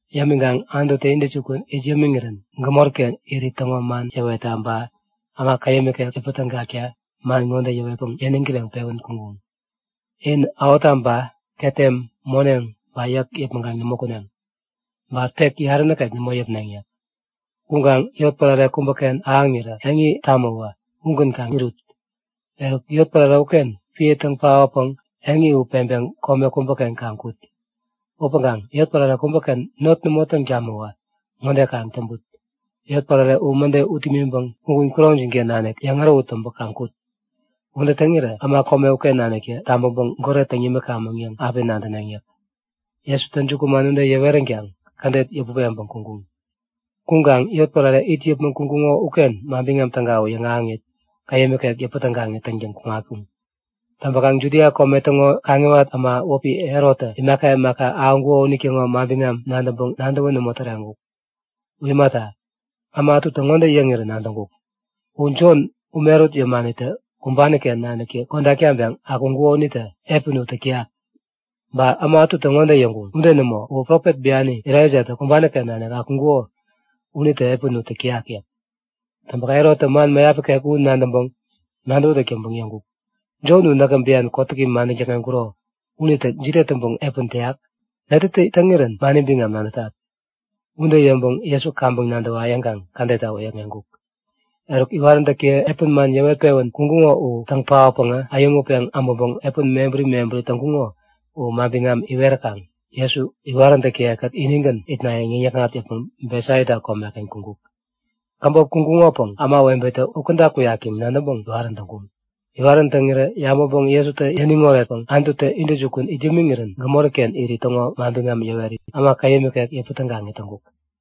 Yämiŋkaŋ Anututä intäjukun it yämiŋirän gämori-ken irit täŋo man yäwetta ba äma käyäm ikek yäpä tägakta man ŋode yäwetpäŋ yäniŋ kireŋpewän kuŋkuŋ; In ähottaba, ketem, moneŋ ba yäk yäpmäŋkaŋ nämo kuneŋ. Ba tek yarä nikek nämo yäpneŋ yäk. Kuŋkaŋ yotpärare kubäken ahäŋirä eŋi tamäwä ugän kaŋ irut. Eruk, yotpärare uken piä täŋ paotpäŋ eŋi u peŋpeŋ kome kubäken kaŋ kut. Upäŋkaŋ yotpärare kubäken not nämo täŋ tamäwä ŋode kaŋ täŋput; Yotpärare u mäde ut imiŋpäŋ kugun kuroŋjin-ken nanik yeŋ ärähut täŋpä kaŋ kut. Ude täŋirä äma kome uken naniktä tabäŋpäŋ goret täŋ yämikamäŋ yäŋ api nadäneŋ yäk. Jesutä jukuman ude yäweränkaŋ kädet yäput peŋpäŋ kuŋkuŋ. Kuŋkaŋ yotpärare it yäpmäŋ kuŋkuŋo uken Manbiŋam Täga u yäŋahäŋit, käyäm ikek yäpä tägaŋit täŋtäŋ kuŋatkuŋ. Täŋpäkaŋ Judia kome täŋo kaŋiwat äma wäpi Herottä imaka imaka ahäŋkuŋo unitäŋo manbiŋam nadäŋpäŋ nadäwän nämo täreŋkuk. U imata, äma ätutä ŋode yäŋirä nadäŋkuk; U Jon, ume ärut yämanitä kumbani-ken naniktä kodak taŋpeŋ akuŋkuko unitä piä u täk täyak. Ba äma ätutä ŋode yäŋkuŋ; Ude nämo, uwä profet biani Elaijatä kumbani-ken nanik akuŋkuko unitä piä u täyak yäk. Täŋpäkaŋ Herottä man mäyap ikek u nadäŋpäŋ nadäwätäk täŋpäŋ yäŋkuk; Jon u näkä bian kotäki madäŋ täkŋeŋkuro unitä jide täŋpäŋ piä täyak? Netätä täŋirän mani biŋam nadätat? Ude yäŋpäŋ Jesu kaŋpäŋ nadäwa yäŋkaŋ kädetta wäyäkŋeŋkuk. Eruk, iwaräntäkiye piä man yäwet-pewän kuŋkuŋo u täŋ paotpäŋä, äyäŋutpeŋ äbäŋpäŋ piä mebäri mebäri täŋkuŋo u biŋam iweräkaŋ Jesu iwaräntäkiye-kät inigän itnayäŋ yäŋ-yäkŋat yäpmäŋ Betsaida komeken kuŋkuk. Käbop kuŋkuŋopäŋ ämawebetä u käda kuyak yäŋ nadäŋpäŋ iwarän täŋkuŋ. Iwarän täŋirä yabäŋpäŋ Jesutä yäniŋ oretpäŋ Anututä intäjukun it yämiŋirän gämoriken irit täŋo manbiŋam yäwerit, äma käyäm ikek yäpä tägaŋit täŋkuk.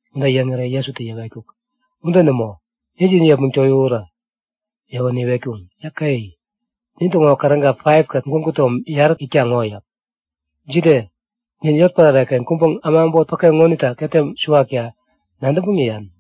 Ude yäŋirä Jesutä yäwetkuk; Ude nämo! Injin yepmäŋ towiwurä! Yäwänä iwetkuŋ; Yäke! Nintäŋo käräga 5kät gwägu tom yarä-tägän itkaŋ ŋo yäk. Jide? Nin yotpärare-ken kuŋpäŋ äma äbot päke ŋonita ketem suwakta nadäŋpäŋ yäyan?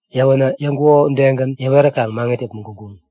Yäwänä yäŋkuko udegän yäweräkaŋ maŋit yäpmäŋ kuŋkuŋ.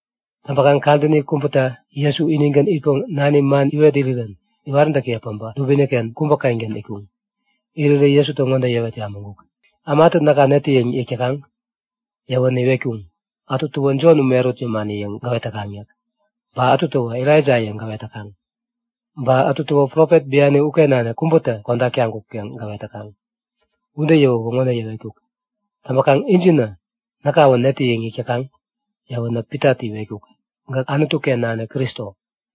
Täŋpäŋ kadäni kubäta Jesu inigän itpäŋ nani man iwet irirän iwaräntäkiye päbä dubini-ken kubä-kengän itkuŋ. Irirä Jesutä ŋode yäwet yabäŋkuk; Ämatä näka netä yäŋ yäk täkaŋ? Yäwänä iwetkuŋ; Ätutäwä Jon, ume ärut yämani yäŋ gäwet täkaŋ yäk. Ba ätutäwä Elaija yäŋ gäwet täkaŋ. Ba ätutäwä profet biani uken nanik kubätä kodak taŋkuk yäŋ gäwet täkaŋ. Ude yäwäwä ŋode yäwetkuk; Täŋpäkaŋ injinä näkawä netä yäŋ yäk täkaŋ? Yäwänä Pitatä iwetkuk; Gäk Anutu-ken nanik Kristo,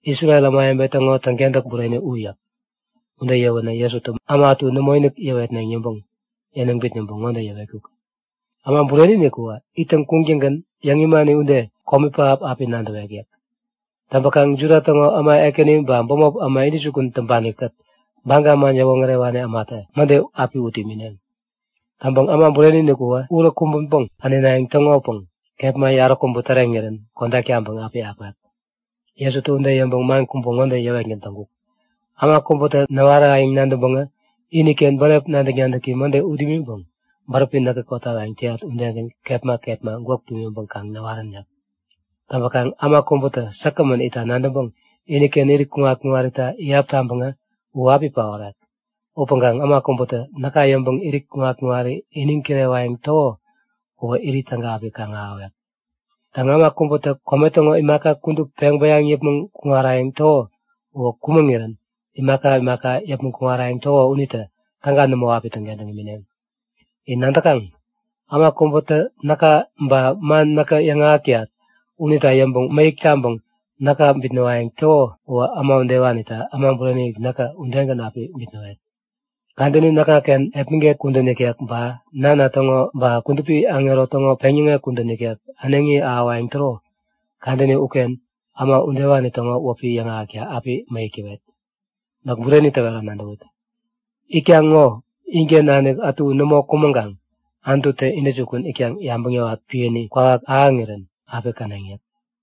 Isrel ämawebe täŋo täŋkentäk bureni u yäk. Ude yäwänä Jesutä äma ätu nämoinik yäwetneŋ yäŋpäŋ yäniŋ bitnäŋpäŋ ŋode yäwetkuk; Äma Bureni-inik uwä ittäŋ kuŋtäŋgän yäŋ imani ude, komi pähap api nadäwek yäk. Täŋpäkaŋ Juda täŋo äma ekäni ba bämop äma intäjukun täŋpani-kät Baga man yäwoŋärewani ämatä mäde api ut imineŋ. Täŋpäŋ Äma Bureni-inik uwä urä kumbänpäŋ änenayäŋ täŋopäŋ kepma yaräkubä täreŋirän kodak taŋpäŋ api akwek. Jesutä ude yäŋpäŋ man kubä ŋode yäwetgän täŋkuk; Äma kubätä näwarayäŋ nadäŋpäŋä iniken bänep nadäk-nadäki mäde ut imiŋpäŋ bäräpi näkä kotawayäŋ täyat udegän kepma kepma gwäk pimiŋpäŋ kaŋ näwarän yäk. Täŋpäkaŋ, äma kubätä säkgämän itta nadäŋpäŋ iniken irit kuŋat-kuŋarita iyap taŋpäŋä u api paorek. Upäŋkaŋ äma kubätä näka yäŋpäŋ irit kuŋat-kuŋari iniŋ kirewayäŋ täko uwä irit täga api kaŋ-ahäwek. Täŋ, äma kubätä kome täŋo imaka kudup peŋ bäyaŋpäŋ yäpmäŋ kuŋarayäŋ täko uwä kumäŋirän imaka imaka yäpmäŋ kuŋarayäŋ täko unitä täga nämo api täŋkentäŋ imineŋ. In nadäkaŋ? Äma kubätä näka ba man näkä yäŋahäk täyat unita yäŋpäŋ mäyäk taŋpäŋ näka bitnäwayäŋ täko uwä äma udewanita Äma Bureni-inik näkä udegän api bitnäwet. Kadäni näkŋaken epmäget kudän ikek ba Nana täŋo ba kudupi aŋero täŋo peŋyäŋek kudän ikek äneŋi ahäwayäŋ täro kadäni uken äma udewani täŋo wäpi yäŋahäkta api mäyäk täwet. Näk bureni täwera nadäwut; Itkaŋ ŋo inken nanik ätu nämo kumäŋkaŋ Anututä intäjukun itkaŋ yabäŋ yäwat piäni kwawak ahäŋirän api käneŋ yäk.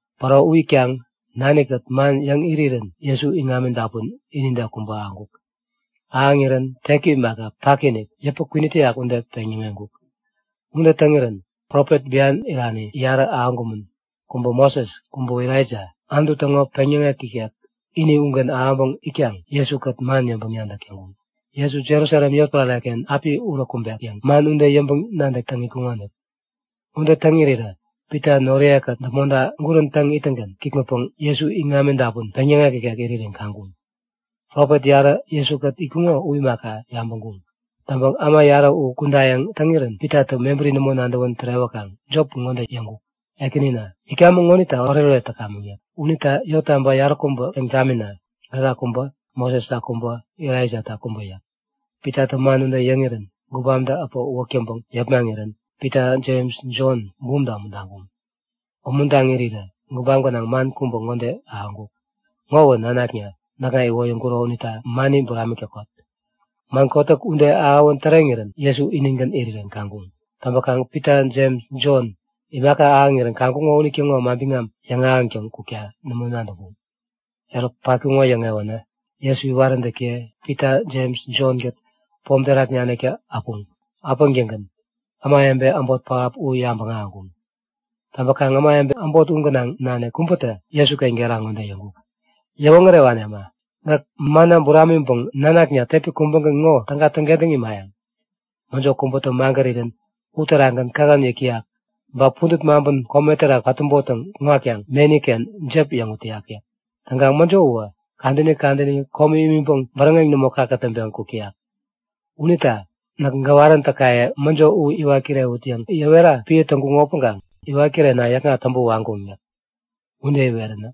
Päro u itkaŋ nani-kät man yäŋ irirän Jesu iŋami dapun inide kubä ahäŋkuk. Ahäŋirän teki imaka, paki-inikinik, yäpä kwinit täyak ude peŋyäŋeŋkuk. Ude täŋirän Profet bian irani yarä ahäŋkumän. Kubä Moses, kubäwä Elaija, Anutu täŋo peŋyäŋek ikek ini ugän ahäŋpäŋ itkaŋ Jesu-kät man yäŋpäŋ-nadäk täŋkuŋ. Jesu Jerusalem yotpärare-ken api urä kumbek yäŋ man ude yäŋpäŋ-nadäk täŋ itkuŋonik. Ude täŋ irirä Pita noriye-kät däpmonta gurän täŋ ittäŋgän kikŋutpäŋ Jesu iŋami dapun peŋyäŋek ikek irirän kaŋkuŋ. Profet yarä Jesu-kät itkuŋo u imaka, yabäŋkuŋ. Täŋpäŋ äma yarä u kudayäŋ täŋirän Pitatä mebäri nämo nadäwän tärewäkaŋ jop ŋode yäŋkuk; Ekänina, itkamäŋ ŋonita oretoret täkamäŋ yäk. Unita yottaba yaräkubä täŋ tamina. Gäka kubä, Mosesta kubä, Elaijata kubä yäk. Pitatä man ude yäŋirän gubamtä äpä uwäk täŋpäŋ yepmaŋirän Pita Jems Jontä bumta umuntaŋkuŋ. Umuntaŋ irirä gubam gänaŋ man kubä ŋode ahäŋkuk; Ŋowä nanakna, näkŋa iwoyäŋkuro unita mani buramik täkot! Man kotäk ude ahäwän täreŋirän Jesu inigän irirän kaŋkuŋ. Täŋpäkaŋ Pita Jems Jon imaka ahäŋirän kaŋkuŋo unitäŋo manbiŋam yäŋahäŋtäŋ kukta nämo nadäŋkuŋ. Eruk patkuŋo yäŋewänä, Jesu iwaräntäkiye Pita Jems Jon-kät pom terak naniktä äpuŋ. Äpäŋtäŋgän ämawebe äbot pähap u yabäŋ ahäŋkuŋ. Täŋpäkaŋ ämawebe äbot u gänaŋ nanik kubätä Jesuken gera ŋode yäŋkuk; Yäwoŋärewani äma! Gäk manna buramiŋpäŋ nanakna tepi kubägän ŋo täga täŋkentäŋ imayäŋ? Mäjo kubätä magärirän uterakgän kähän yäk täyak. Ba pudät maŋpän kome terak patäbottäŋ kuŋatkaŋ meni-ken jep yäŋut täyak yäk. Täŋkaŋ mäjo uwä kadäni kadäni komi imiŋpäŋ bäräŋeŋ nämo kakätäŋpeŋ kuk täyak. Unita näk gäwaräntäkaye mäjo u iwat kirewut yäŋ yäwera piä täŋkuŋo upäŋkaŋ iwat kirena yäkŋat täŋpä waŋkuŋ yäk. Ude iwerirän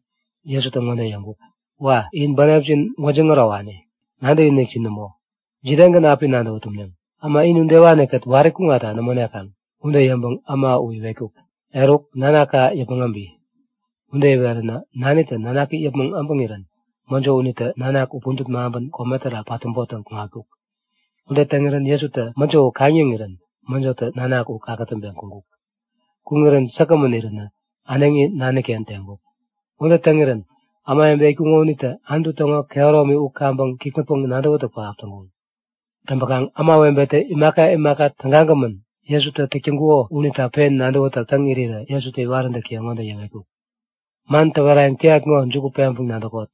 Jesutä ŋode yäŋkuk; Wa! In bänepjin gwäjiŋ ärowani. Nadäkinikjin nämo! Jidegän api nadäwä tumneŋ? Äma in udewani-kät wari kuŋatta nämo nekaŋ! Ude yäŋpäŋ äma u iwetkuk; Eruk, nanaka yäpmäŋ äbi! Ude iweränä nanitä nanaki yäpmäŋ äbäŋirän mäjo unitä nanak u pudät maŋpän kome terak patäbottäŋ kuŋatkuk. Ude täŋirän Jesutä mäjo u kaŋ-yäŋirän mäjotä nanak u kakätäŋpeŋ kuŋkuk. Kuŋirän säkgämän iränä äneŋi nani-ken teŋkuk. Ude täŋirän ämawebe itkuŋo unitä Anutu täŋo kehäromi u kaŋpäŋ kikŋutpäŋ-nadäwätäk pähap täŋkuŋ. Täŋpäkaŋ ämawebetä imaka imaka tägagämän Jesutä täk täŋkuko unita pen nadäwätäk täŋ irirä Jesutä iwaräntäkiye ŋode yäwetkuk; Man täwerayäŋ täyat ŋo juku peŋpäŋ nadäkot;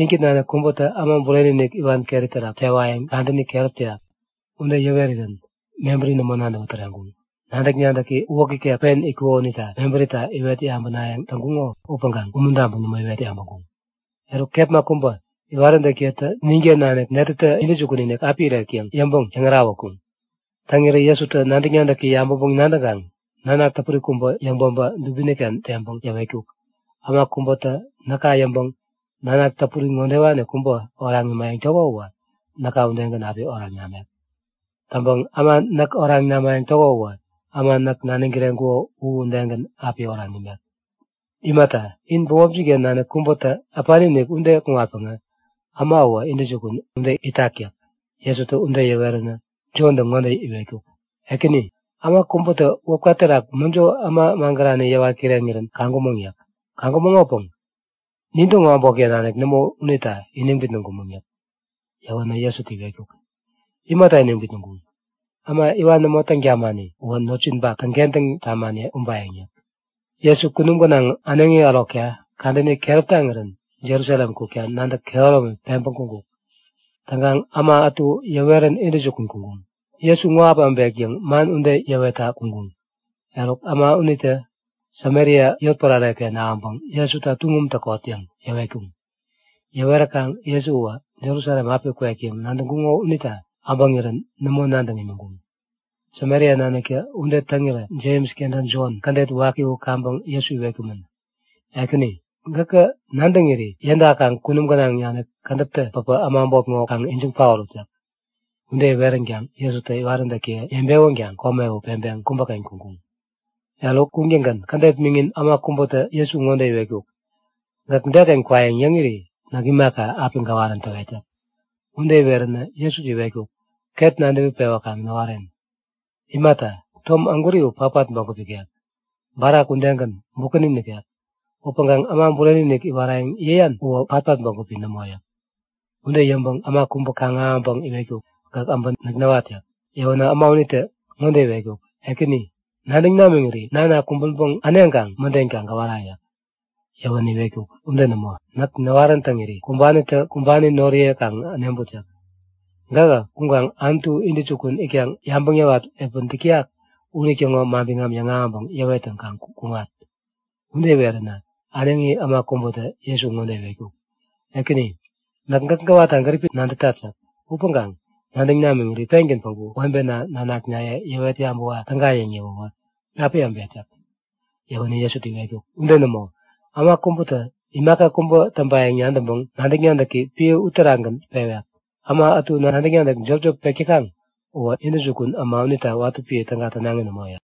Inkät nanik kubätä Äma Bureni-inik iwan keri terak tewayäŋ kadäni keräpi täyak. Ude yäwerirän mebäri nämo nadäwä täreŋkuŋ. Nadäk-nadäki uwäk ikek pen itkuko unita mebärita iwet yabänayäŋ täŋkuŋo upäŋkaŋ umuntaŋpäŋ nämo iwet yabäŋkuŋ. Eruk kepma kubä, iwaräntäkiyetä nin-ken nanik netätä intäjukun-inik api irek yäŋ yäŋpäŋ yäŋärahutkuŋ. Täŋirä Jesutä nadäk-nadäki yabäŋpäŋ-nadäŋkaŋ nanak täpuri kubä yäŋ-päbä dubini-ken teŋpäŋ yäwetkuk; Äma kubätä näka yäŋpäŋ nanak täpuri ŋodewani kubä oraŋ imayäŋ täko uwä näka udegän api oraŋ namek. Täŋpäŋ äma näk oraŋ namayäŋ täko uwä äma näk naniŋ kireŋkuko u udegän api oraŋ imek. Imata, in bämopjin-ken nanik kubätä äpani-inik ude kuŋatpäŋä äma uwä intäjukun ude itak yäk. Jesutä ude yäweränä Jontä ŋode iwetkuk; Ekäni! Äma kubätä wäpka terak mäjo äma magärani yäwat kireŋirän kaŋkumäŋ yäk. Kaŋkumäŋopäŋ nintäŋo äbotken nanik nämo unita iniŋ bitnäŋkumäŋ yäk. Yäwänä Jesutä iwetkuk; Imata iniŋ bitnäŋkuŋ? Äma iwan nämo täŋ tamani uwä notjinpak täŋkentäŋ tamani ubayäŋ yäk. Jesu kunum gänaŋ äneŋi ärokta kadäni keräp taŋirän Jerusalem kukta nadäk kehäromi peŋpäŋ kuŋkuk. Täŋkaŋ äma ätu yäwerän intäjukun kuŋkuŋ. Jesu ŋo api äbek yäŋ man ude yäwetta kuŋkuŋ. Eruk, äma unitä Samaria yotpärare-ken ahäŋpäŋ Jesuta tuŋum täkot yäŋ yäwetkuŋ. Yäweräkaŋ Jesu uwä Jerusalem api kwek yäŋ nadäŋkuŋo unita äbäŋirän nämo nadäŋ imiŋkuŋ. Samaria naniktä ude täŋirä Jems kenta Jon, kädet waki u kaŋpäŋ Jesu iwetkumän; Ekäni, gäkä nadäŋiri yädakaŋ kunum gänaŋ nanik kädäptä päpä äma äbot ŋo kaŋ ijiŋ paorut yäk. Ude iweränkaŋ Jesutä iwaräntäkiye yebewänkaŋ kome u peŋpeŋ kubäken kuŋkuŋ. Eruk kuŋtäŋgän kädet miŋin, äma kubätä Jesu ŋode iwetkuk; Gäk deken kwayäŋ yäŋiri näk imaka, api gäwarän täwet yäk. Ude iweränä Jesutä iwetkuk; Ket nadäwi pewäkaŋ näwaren. Imata, tom ägwäri u patpat bägup ikek. Barak udegän, bukäni nikek. Upäŋkaŋ Äma Bureni-inik iwarayäŋ yäyan uwä patpat bägupi nämo yäk. Ude yäŋpäŋ äma kubä kaŋ-ahäŋpäŋ iwetkuk; Gäk abä näk näwat yäk. Yäwänä äma unitä ŋode iwetkuk; Ekäni, nadäŋ namiŋiri nana kumbänpäŋ äneŋkaŋ mäden kaŋ gäwara yäk. Yäwänä iwetkuk; Ude nämo! Näk näwarän täŋiri kumbanitä kumbani noriye kaŋ äneŋput yäk. Gähä kuŋkaŋ Anututä intäjukun itkaŋ yabäŋ yäwat piä täk täyak unitäŋo manbiŋam yäŋahäŋpäŋ yäwettäŋ kaŋ kuŋat. Ude iweränä äneŋi äma kubätä Jesu ŋode iwetkuk; Ekäni, näk gäk gäwatta gäripi nadätat yäk. Upäŋ, nadäŋ namiŋiri pengän päŋku webena nanaknaye yäwet yabäwa täga yäŋ yäwäwä api äbet yäk. Yäwänä Jesutä iwetkuk; Ude nämo, äma kubätä imaka kubä täŋpayäŋ nadäŋpäŋ nadäk-nadäki piä unitagän pewek. Äma ätu nadäk-nadäk jopjop pek täkaŋ uwä intäjukun äma Anutu unita watä piä täga tänaŋi nämo yäk.